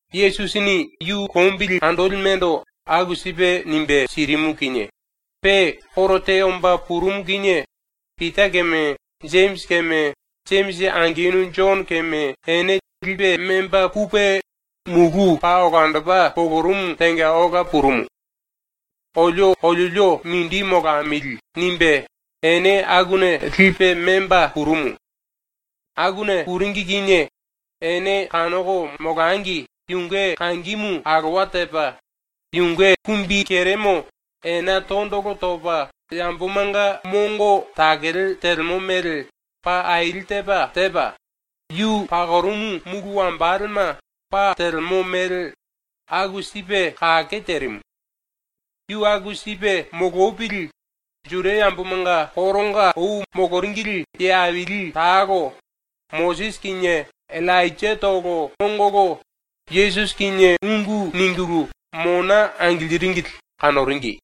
Yesusini ⸤yu lombili andolimendo aku sipe nimbe sirimu kinie⸥ pe koro te omba purumu kinie Pita keme Jemisi keme Jemisi angenu Jono keme ene lipe memba pupe mulú paa olandopa polorumu tenga ola purumu. ‘Olio oliolio mindi molamili.’ nimbe ene akuna lipe memba purumu. Akuna puringi kinie ene kanoko molangi yunge kangimu alowa tepa, yunge kumbikeremo ena tondolo topa yambomanga mongo takele telemo mele pa aili tepa tepa, yu pakorumu mulu wambalema pa telemo mele aku sipe kake terimu. Yu aku sipe molopili, ⸤Juda yambomanga koronga ou moloringili ye aili talo,⸥ Mosisi kinie Illainjatolo ongolo Yesusi kinie ungu ningulu mona angiliringili kanoringi.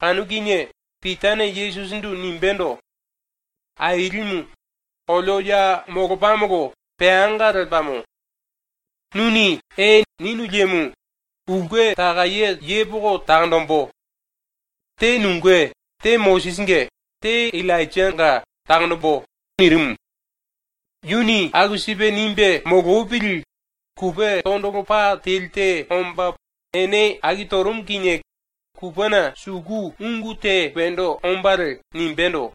Kanu kinie Pitane Yesusindu nimbendo: “Ailimu, olio ya molopamolo peanga lepamo. Nuni “E.” ninu liemo, ulke takaye yepoko takonjimbu. Te nunge, te Mosisinge, te Illainjanga takonjimbu.” nirimu. Yuni aku sipe nimbe molopili kupe tondolo pa teli te omba ene aki torumu kinie kupena suku ungu te wendo ombalie nimbendo: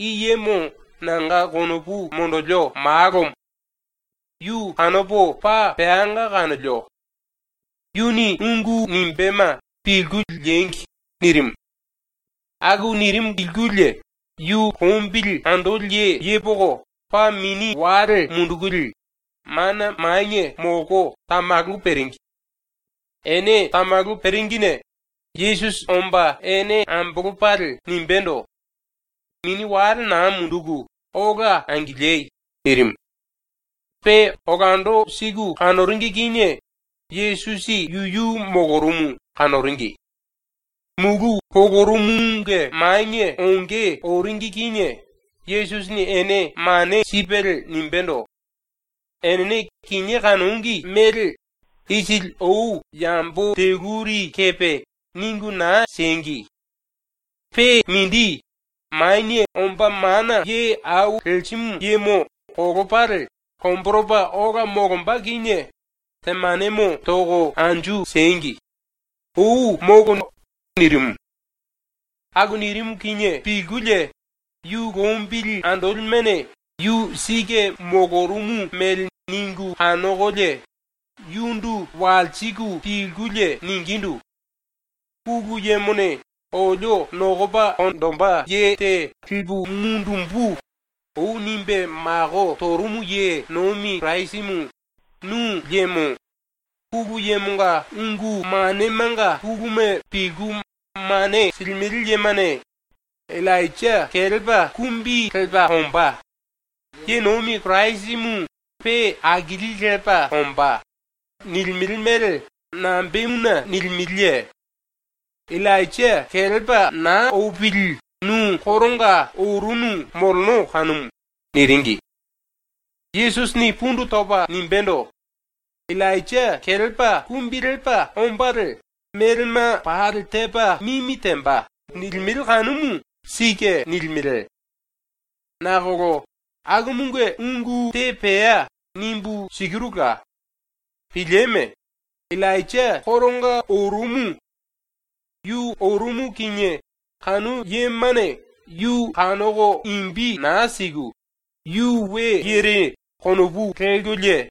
“I yemo nanga konopu monjilio Malomo. Yu kanopo paa peanga kanolio. Yuni ungu nimbéma pilku liengi.” nirimu. Aku nirimu pilkulie yu lombili andoli ye ⸤yepoko⸥ paa mini wale mundukulie mana manie molko tamalu peringi. Ene tamalu peringine Yesusi omba ene ambolopalie nimbendo: “Mini wale na munduku ola angiliei.” nirimu. Pe olando siku kanoringi kinie Yesusi yuyu molorumu kanoringi. Mulú polorumumunge manie onge oringi kinie Yesusini ene mane sipelie nimbendo: “Enene kinié kanongi mele isili ou yambo teluri kepe ningu na siengi. Pe mindi, Manie Omba Mana Ye Au Lerimu Yemo kolopalie lomboropa ola molomba kinie temanemo toko anju siengi. Ou molo!” nirimu. Aku nirimu kinie pilkulie yu lombili andolimene ⸤yu sike molorumu mele ningu kanokolie⸥ yundu walsiku pilkulie ningindu: “⸤Pulu Yemone ‘olio nokopa konjipe lipe mundumbu.’ ou nimbe mako torumu ye nomi Kirasimu nu liemo⸥ Pulu Yemonga ungu manemanga puluma pilku mane silimele yemane “Illainja ⸤kelepa⸥ kumbi lepa ombá. ⸤Ye nomi Kirasimu pe akilipe ombá.⸥” nilimele mele nambemuna nilimeleye? ⸤Illainja kelepa na opili nu koronga orunu moleno kanumu.⸥” niringi. Yesusini pundu topa nimbendo: “ “Illainja ⸤kelepa⸥ kumbi lepa ombalie melema pali tepa mimi temba.” nilimele kanumu sike nilimele. Nakolo ⸤akumunge ungu te pea nimbu sikirula.⸥ Pilieme. Illainja koronga orumu. Yu orumu kinie ⸤kanu yemane⸥ yu kanoko imbi na siku ‘Yu we yere.’ konopu lelkolie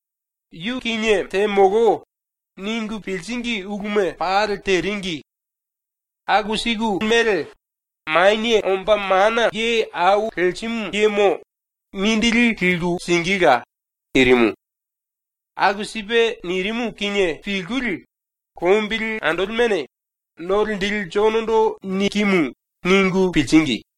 ‘Yu kinie temolo.’ ningu piliringi uluma pali teringi. Aku siku mele Manie Omba Mana Ye Au Lerimu Yemo mindili liku singíla.” nirimu. Aku sipe nirimu kinie pilkulie lombili andolimene ‘No Linjili Jonondo nikimu.’ ningu piliringi.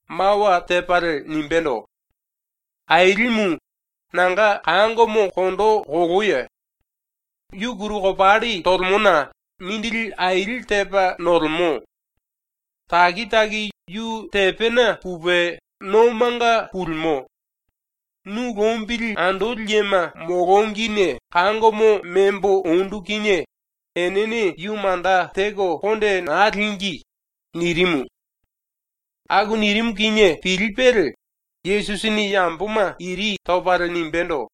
mawa tepalie nimbendo: “Ailimu, nanga kangomo kondo koloyo. Yu kuru kopalli tolemona mindili aili tepa nolemo. Taki taki yu tepena pupe nomanga pulimo. Nu lombili andoli yema molongine kangomo membo ondu kinie enene yu manda teko konde na língi.” nirimu. Aku nirimu kinie pilipelie Yesusini ⸤yamboma iri topalie⸥ nimbendo: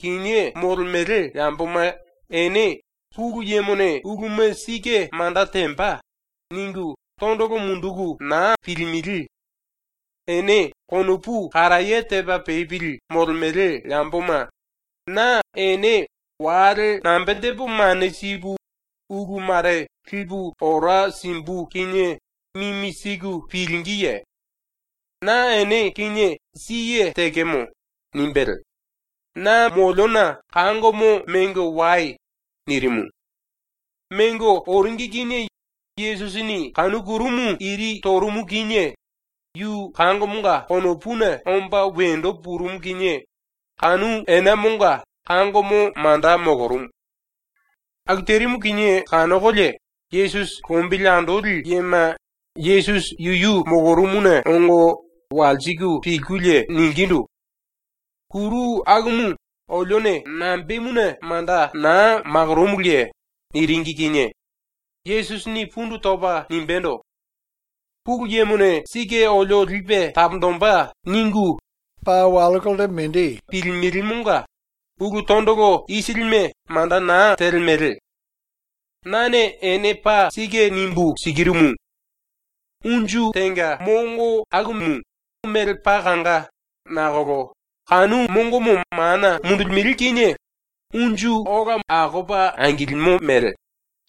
“Kinié molemele yamboma ene ⸤‘Pulu Yemone uluma sike manda temba.’ ningu⸥ tondolo munduku na pilimele. Ene konopu karaye tepa pepili molemele yamboma, na ene wale nambe tepo mane sipu ulu mare lipu ora simbu kinie mimi siku pilingíye? ⸤Na ene kinie siye tekemo.⸥” nimbelie “Na moliona kangomo mengo wai.” nirimu. Mengo oringi kinie Yesusini kanu kurumu iri torumu kinie yu kangomonga ⸤konopuna⸥ omba wendo purumu kinie kanu enamonga kangomo manda molorumu. Aku terimu kinie kanokolie Yesusi lombili andoli yema Yesusi yuyu molorumuna ongo walsiku pilkulie ningindu: “Kuru akumu olione nambemuna manda na makoromuluye?” niringi kinie Yesusini pundu topa nimbendo: “ ⸤‘Pulu Yemone sike olio lipe taponjimbe.’ ningu⸥ tondolo munduku na pilimelemonga ulu tondolo isilime manda na telemele. Nane ene paa sike nimbu sikirumu: Unju tenga mongo akumu mele paa kanga nakolo kanu mongomo mana mundulimele kinie unju akopa ai lepa angilimo mele,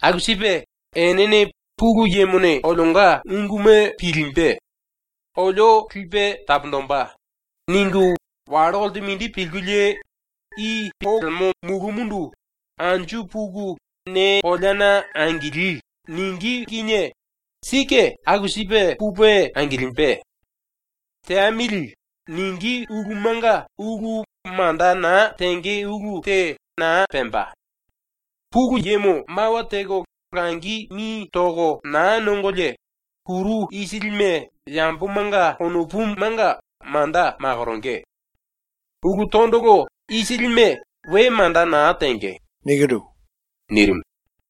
aku sipe enene ‘Pulu Yemone olionga unguma pilimbe. Olio lipe taponjimbe.’ ningu wallo kolte mindi pilkulie i polemo mulúmundu “Anju puku ne koleana angili.” ningí kinie sike aku sipe pupe angilimbe. ‘Teamili.’ ningí ulumanga ulu manda na tenge ulu te na pemba. (Pulu Yemo mawa teko langi mi toko na nongolie kuru isilime yambomanga konopumanga manda makoronge. Ulu tondolo isilime we manda na tenge.)” nirimu.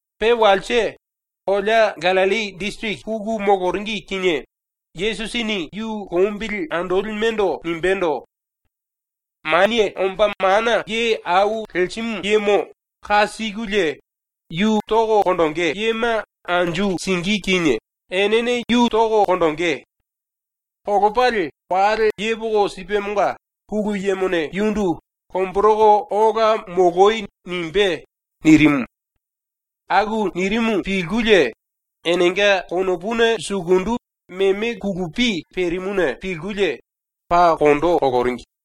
⸤Pe walse,⸥ kolea Gallilli disiriki puku moloringi kinie Yesusini yu lombili andolimendo nimbendo: “Manie Omba Mana Ye Au Lerimu Yemo ⸤ka sikulie yu tonge⸥ yema anju singí kinie enene yu toko konjingí. Kolopalie wale yepoko sipemonga Pulu Yemone yundu ‘Lomboroko ola moloi.’ nimbé.” nirimu. Aku nirimu pilkulie enenga konopuna sukundu meme kulupi perimuna pilkulie paa kondo koloringi.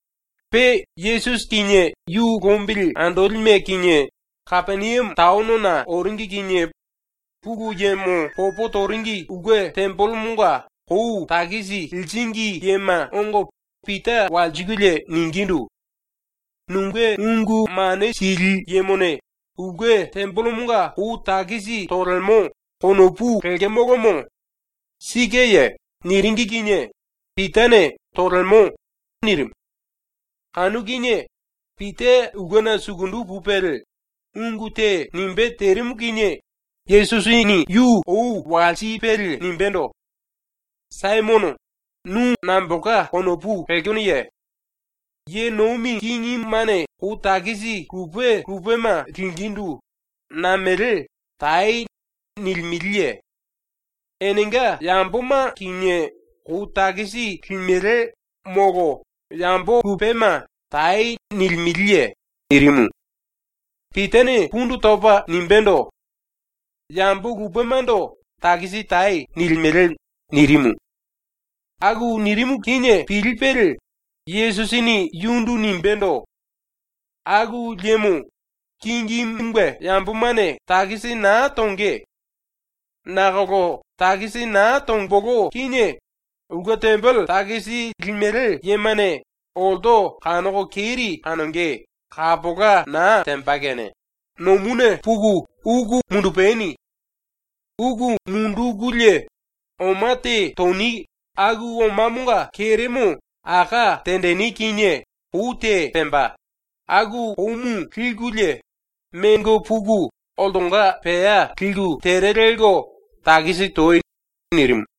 Pe Yesusi kinie yu lombili andolime kinie Kapeniame taonona oringi kinie Pulu Yemo popo toringi ulke tembelemonga kou takisi liringi yema ongo Pita walsikulie ningindu: “‘Nunge ungu mane sili yemone ulke tembelemonga kou takisi tolemo.’ konopu lekemolomo. Sikeye?” niringi kinie Pitane “Tolemo.” nirimu. Kanu kinie Pita ulkena sukundu pupelie ungu te nimbé terimu kinie Yesusini yu ou walsipelie nimbendo: “Saimono, nu nambolka konopu lekenoye? Ye nomi kingimene kou takisi lupe lupema lingíndu namele “Tai.” nilimeleye? Enenga yamboma kinie kou takisi limele molo yambo lupema “Tai.” nilimeleye?” nirimu. Pitane pundu topa nimbendo: “Yambo lupemando “Takisi tai.” nilimele.” nirimu. Aku nirimu kinie pilipelie Yesusini yundu nimbendo: “Aku liemo kingimunge yambomane takisi na tonge. Nakolo takisi na tombolo kinie ulke tembele takisi limele yemane olto kanoko keri kanonge kapola na temba kene nomuna puku uku mundupani. Uku mundukulie oma te toni aku omamonga keremo aká tenjini kinie kou te pemba, aku koumu likulie mengo puku oltonga pea liku tere lelko takisi toi.” nirimu.